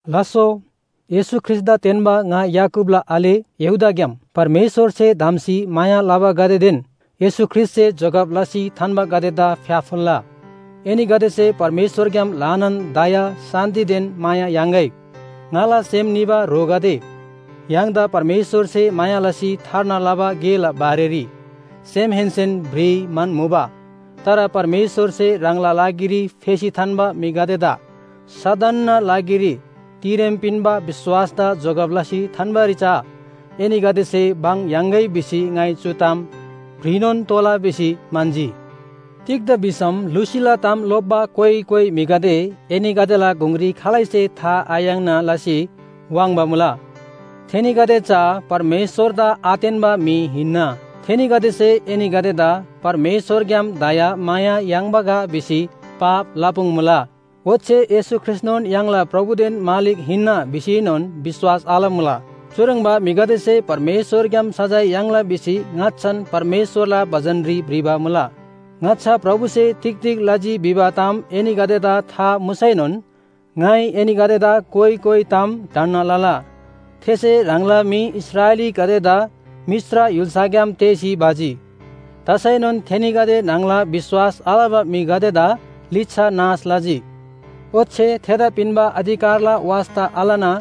लास्‍सो, येशू ख्रीष्‍टदा तेन्‍बा ङा याकूबला आले यहूदाग्‍याम परमेश्‍वरसे धम्‍सी माया लबागदेदेन येशू ख्रीष्‍टसे जोगब लसी थान्‍बागदेदा फ्‍याफुल्‍ला! एनीगदेसे परमेश्‍वरग्‍याम ल्‍हानान दया, शान्‍तिदेन माया याङ्‌गै। ङाला सेम निबा ह्रोगदे, य्‍हाङदा परमेश्‍वरसे माया लसी थार्ना लबा गेला बारेरी सेमहेन्‍सेन भ्रिइ म्‍हन्‍मुबा। तर परमेश्‍वरसे ह्राङला लागिरी फेसी थान्‍बा म्‍हिगदेदा सदनना लागिरी तिरेम पिन्‍बा विश्‍वासदा जोगब लसी थान्‍बारी चा एनीगदेसे भङ याङ्‌गै भिसी ङाइ चु ताम भ्रिनोन तोःला भिसी म्‍हन्‍जी। तिग्‍दा भिसम लुसीला ताम लोप्‍बा कोइ कोइ म्‍हिगदे एनीगदेला गुङरी खालैसे था आयाङ्ना लसी वाङ्बा मुला। थेनीगदे चा परमेश्‍वरदा आतेन्‍बा म्‍हि हिन्‍ना। थेनीगदेसे एनीगदेदा परमेश्‍वरग्‍याम दयामाया याङ्बा गा भिसी पाप लपुङ्मुला। ओच्‍छे येशू ख्रीष्‍टनोन य्‍हाङला प्रभुदेन मालिक हिन्‍ना भिसीएनोन विश्‍वास आलमुला। चुह्रङ्बा म्‍हिगदेसे परमेश्‍वरग्‍याम सजाय याङ्ला भिसी ङाच्‍छान परमेश्‍वरला बचनरी भ्रिबा मुला। ङाच्‍छा प्रभुसे तिग तिग लजी भिबा ताम एनीगदेदा था मुसैनोन ङाइ एनीगदेदा कोइ कोइ ताम ढन्‍ना लला। थेसे ह्राङला म्‍हि इस्राएलीगदेदा मिश्र य्‍हुल्‍साग्‍याम तेःसी भजी। तसैनोन थेनीगदे न्‍हङला विश्‍वास आलबा म्‍हिगदेदा लिच्‍छा नाश लजी। ओच्‍छे थेदा पिन्‍बा अधिकारला वास्‍ता आलना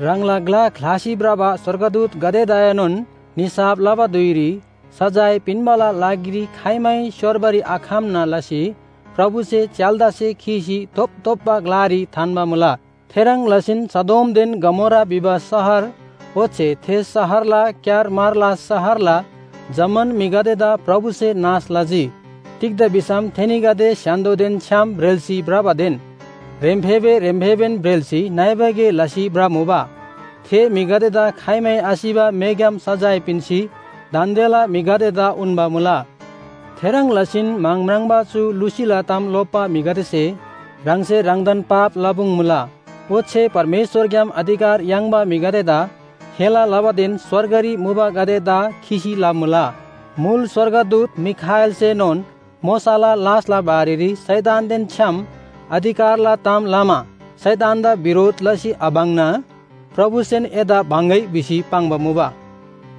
ह्राङला ग्‍ला ख्‍लासी भ्रबा स्‍वर्गदूतगदेदाएनोन निसाफ लबा धुइरी सजाय पिन्‍बाला लागिरी खाइमै स्‍योर्बारी आखम्‍ना लसी प्रभुसे च्‍याल्‍दासे खीसी धोपधोप्‍बा ग्‍लारी थान्‍बा मुला। थेह्रङ् लसीन सदोमदेन गमोरा भिबा शहर ओच्‍छे थे शहरला क्‍यारमारला शहरला जम्‍मान म्‍हिगदेदा प्रभुसे नाश लजी। तिग्‍दा भिसम थेनीगदे स्‍य्‍हान्‍दोदेन छ्‌याम ब्रेल्‍सी भ्रबादेन ह्रेम्‍फेबे ह्रेम्‍फेबेन ब्रेल्‍सी नइबा गे लसी भ्रमुबा। थे म्‍हिगदेदा खाइमै आसिबा मेग्‍याम सजाय पिन्‍सी दान्‍देला म्‍हिगदेदा उन्‍बा मुला। थेह्रङ् लसीन म्‍हङ म्राङ्बा चु लुसीला ताम लोप्‍बा म्‍हिगदेसे ह्राङसे ह्राङदान पाप लपुङ्मुला, ओच्‍छे परमेश्‍वरग्‍याम अधिकार याङ्बा म्‍हिगदेदा हेला लबादेन स्‍वर्गरी मुबागदेदा खिसी लमुला। मुल स्‍वर्गदूत मिखाएलसेनोन मोशाला लासला बारेरी शैतानदेन छ्‌याम अधिकारला ताम लमा शैतानदा बिरोध लसी आबङ्ना “प्रभुसेन एदा बङ्‍गै” भिसी पाङ्बा मुबा।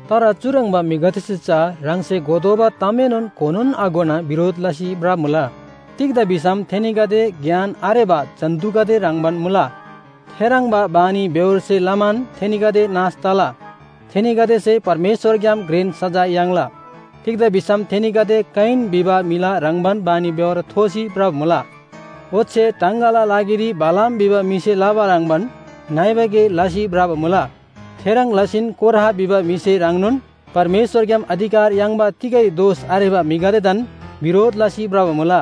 तर चुह्रङ्बा म्‍हिगदेसे चा ह्राङसे घोतोःबा तामएनोन घोनोन आघोना बिरोध लसी भ्रमुला। तिग्‍दा भिसम थेनीगदे ज्ञान आरेबा जन्‍तुगदे ह्रङ्‌बान मुला। थेह्रङ्बा बानीबेहोरसे लमान थेनीगदे नाश तला। थेनीगदेसे परमेश्‍वरग्‍याम घ्रेन सजाय याङ्ला। तिग्‍दा भिसम थेनीगदे कयिन भिबा म्‍हिला ह्रङ्‌बान बानीबेहोर थोसी भ्रबा मुला। ओच्‍छे टाङगाला लागिरी बालाम भिबा म्‍हिसे लबा ह्रङ्‌बान नइबा गे लसी भ्रबा मुला। थेह्रङ् लसीन कोरह भिबा म्‍हिसे ह्रङ्नोन परमेश्‍वरग्‍याम अधिकार याङ्बा तिगै दोष आरेबा म्‍हिगदेदान बिरोध लसी भ्रबा मुला।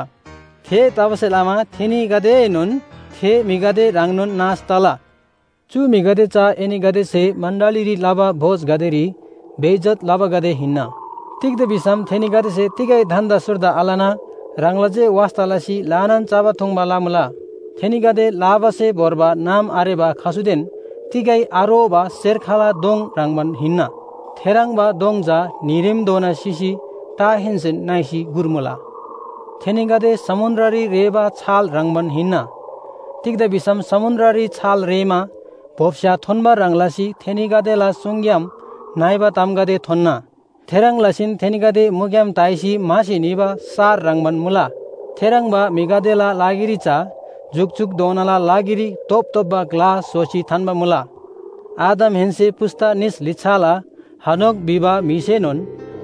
थेतबासेलमा थेनीगदेएनोन थे म्‍हिगदे ह्रङ्नोन नाश तला। चु म्‍हिगदे चा एनीगदेसे मण्‍डलीरी लबा भोजगदेरी बेइज्‍जत लबागदे हिन्‍ना। तिग्‍दा भिसम थेनीगदेसे तिगै धन्‍दा सुर्दा आलना ह्राङला जे वास्‍ता लसी ल्‍हानान चबा थुङ्बा लमुला। थेनीगदे लाबासे भोर्बा नाम आरेबा खसुदेन तिगै आरोबा सेर्खला दोङ ह्रङ्‌बान हिन्‍ना। थेह्रङ्बा दोङ चा न्‍हीरेमधोना सिसी टाहेन्‍सेन नइसी गुर्मुला। थेनीगदे समुन्‍द्ररी रेःबा छाल ह्रङ्‌बान हिन्‍ना। तिग्‍दा भिसम समुन्‍द्ररी छाल रेःमा बोप्‍स्‍या थोन्‍बा ह्रङ् लसी थेनीगदेला सुङग्‍याम नइबा तामगदे थोन्‍ना। थेह्रङ् लसीन थेनीगदे मुग्‍याम ताइसी म्‍हासी निबा सार ह्रङ्‌बान मुला। थेह्रङ्बा म्‍हिगदेला लागिरी चा जुकजुकधोनाला लागिरी धोपधोप्‍बा ग्‍ला स्‍होसी थान्‍बा मुला। आदमहेन्‍से पुस्‍ता निस लिच्‍छाला हनोक भिबा म्‍हिसेनोन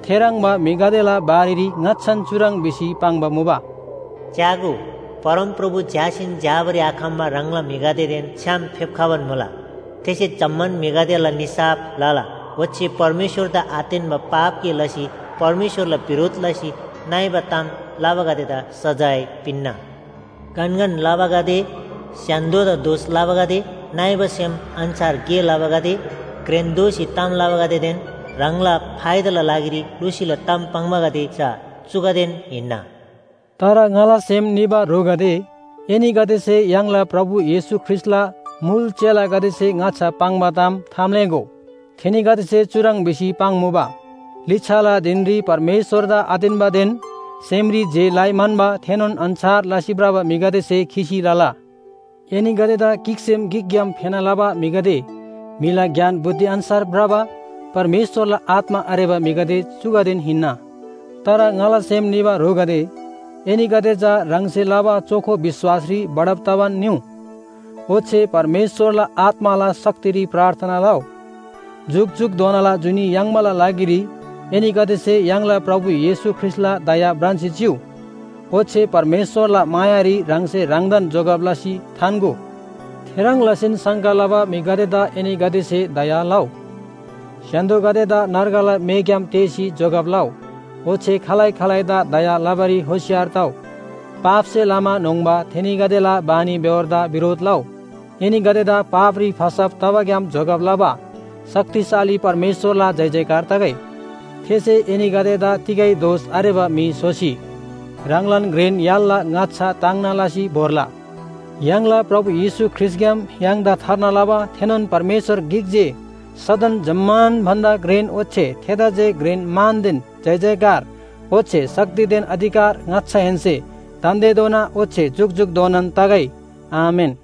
थेह्रङ्बा म्‍हिगदेला बारेरी ङाच्‍छान चुह्रङ् भिसी पाङ्बा मुबा, “च्‍यागो, परमप्रभु झ्‍यासीन झ्‍याबारी आखम्‍बा ह्राङला म्‍हिगदेदेन छ्‌याम फेप्‍खबान मुला। थेसे जम्‍मान म्‍हिगदेला निसाफ लला ओच्‍छे परमेश्‍वरदा आतेन्‍ना पाप गे लसी परमेश्‍वरला बिरोध लसी नइबा ताम लबागदेदा सजाय पिन्‍ना। गनगन लबागदे, स्‍य्‍हान्‍दोदा दोष लबागदे, नइबा सेम अन्‍छार गे लबागदे, घ्रेन दोःसी ताम लबागदेदेन ह्राङला फाइदाला लागिरी लुसीला ताम पाङ्बागदे चा चुगदेन हिन्‍ना।” तर ङाला सेम निबा ह्रोगदे, एनीगदेसे य्‍हाङला प्रभु येशू ख्रीष्‍टला मुल चेलागदेसे ङाच्‍छा पाङ्बा ताम थाम्‍लेःगो। थेनीगदेसे चुह्रङ् भिसी पाङ्मुबा, “लिच्‍छाला धिनरी परमेश्‍वरदा आतेन्‍बादेन सेमरी जे लइ म्‍हन्‍बा थेनोन अन्‍छार लसी भ्रबा म्‍हिगदेसे खिसी लला।” एनीगदेदा गिकसेम गिकग्‍याम फेना लबा म्‍हिगदे, म्‍हिला ज्ञान बुद्धि अन्‍छार भ्रबा परमेश्‍वरला आत्‍मा आरेबा म्‍हिगदे चुगदेन हिन्‍ना। तर ङाला सेम निबा ह्रोगदे, एनीगदे चा ह्राङसे लबा चोखो विश्‍वासरी बढब तबान निउ। ओच्‍छे परमेश्‍वरला आत्‍माला शक्तिरी प्रार्थना लउ। जुकजुकधोनाला जुनी याङ्बाला लागिरी एनीगदेसे य्‍हाङला प्रभु येशू ख्रीष्‍टला दया भ्रान्‍सी चिउ, ओच्‍छे परमेश्‍वरला मायारी ह्राङसे ह्राङदान जोगब लसी थान्‍गो। थेह्रङ् लसीन शङ्का लबा म्‍हिगदेदा एनीगदेसे दया लउ। स्‍य्‍हान्‍दोगदेदा नर्गला मेग्‍याम तेःसी जोगब लउ, ओच्‍छे खालै खालैदा दया लबारी होशियार तउ, पापसे लमा न्‍होङ्बा थेनीगदेला बानीबेहोरदा बिरोध लउ। एनीगदेदा पापरी फसब तबाग्‍याम जोगब लबा शक्तिशाली परमेश्‍वरला जयजयकार तगै। थेसे एनीगदेदा तिगै दोष आरेबा म्‍हि स्‍होसी ह्राङलान घ्रेन य्‍हालला ङाच्‍छा ताङ्ना लसी भोर्ला। य्‍हाङला प्रभु येशू ख्रीष्‍टग्‍याम य्‍हाङदा थार्ना लबा थेनोन परमेश्‍वर गिक जे सदन जम्‍मान भन्‍दा घ्रेन ओच्‍छे थेदा जे घ्रेन मानदेन जयजयकार ओच्‍छे शक्तिदेन अधिकार ङाच्‍छाहेन्‍से दान्‍देधोना ओच्‍छे जुकजुकधोनान तगै। आमेन।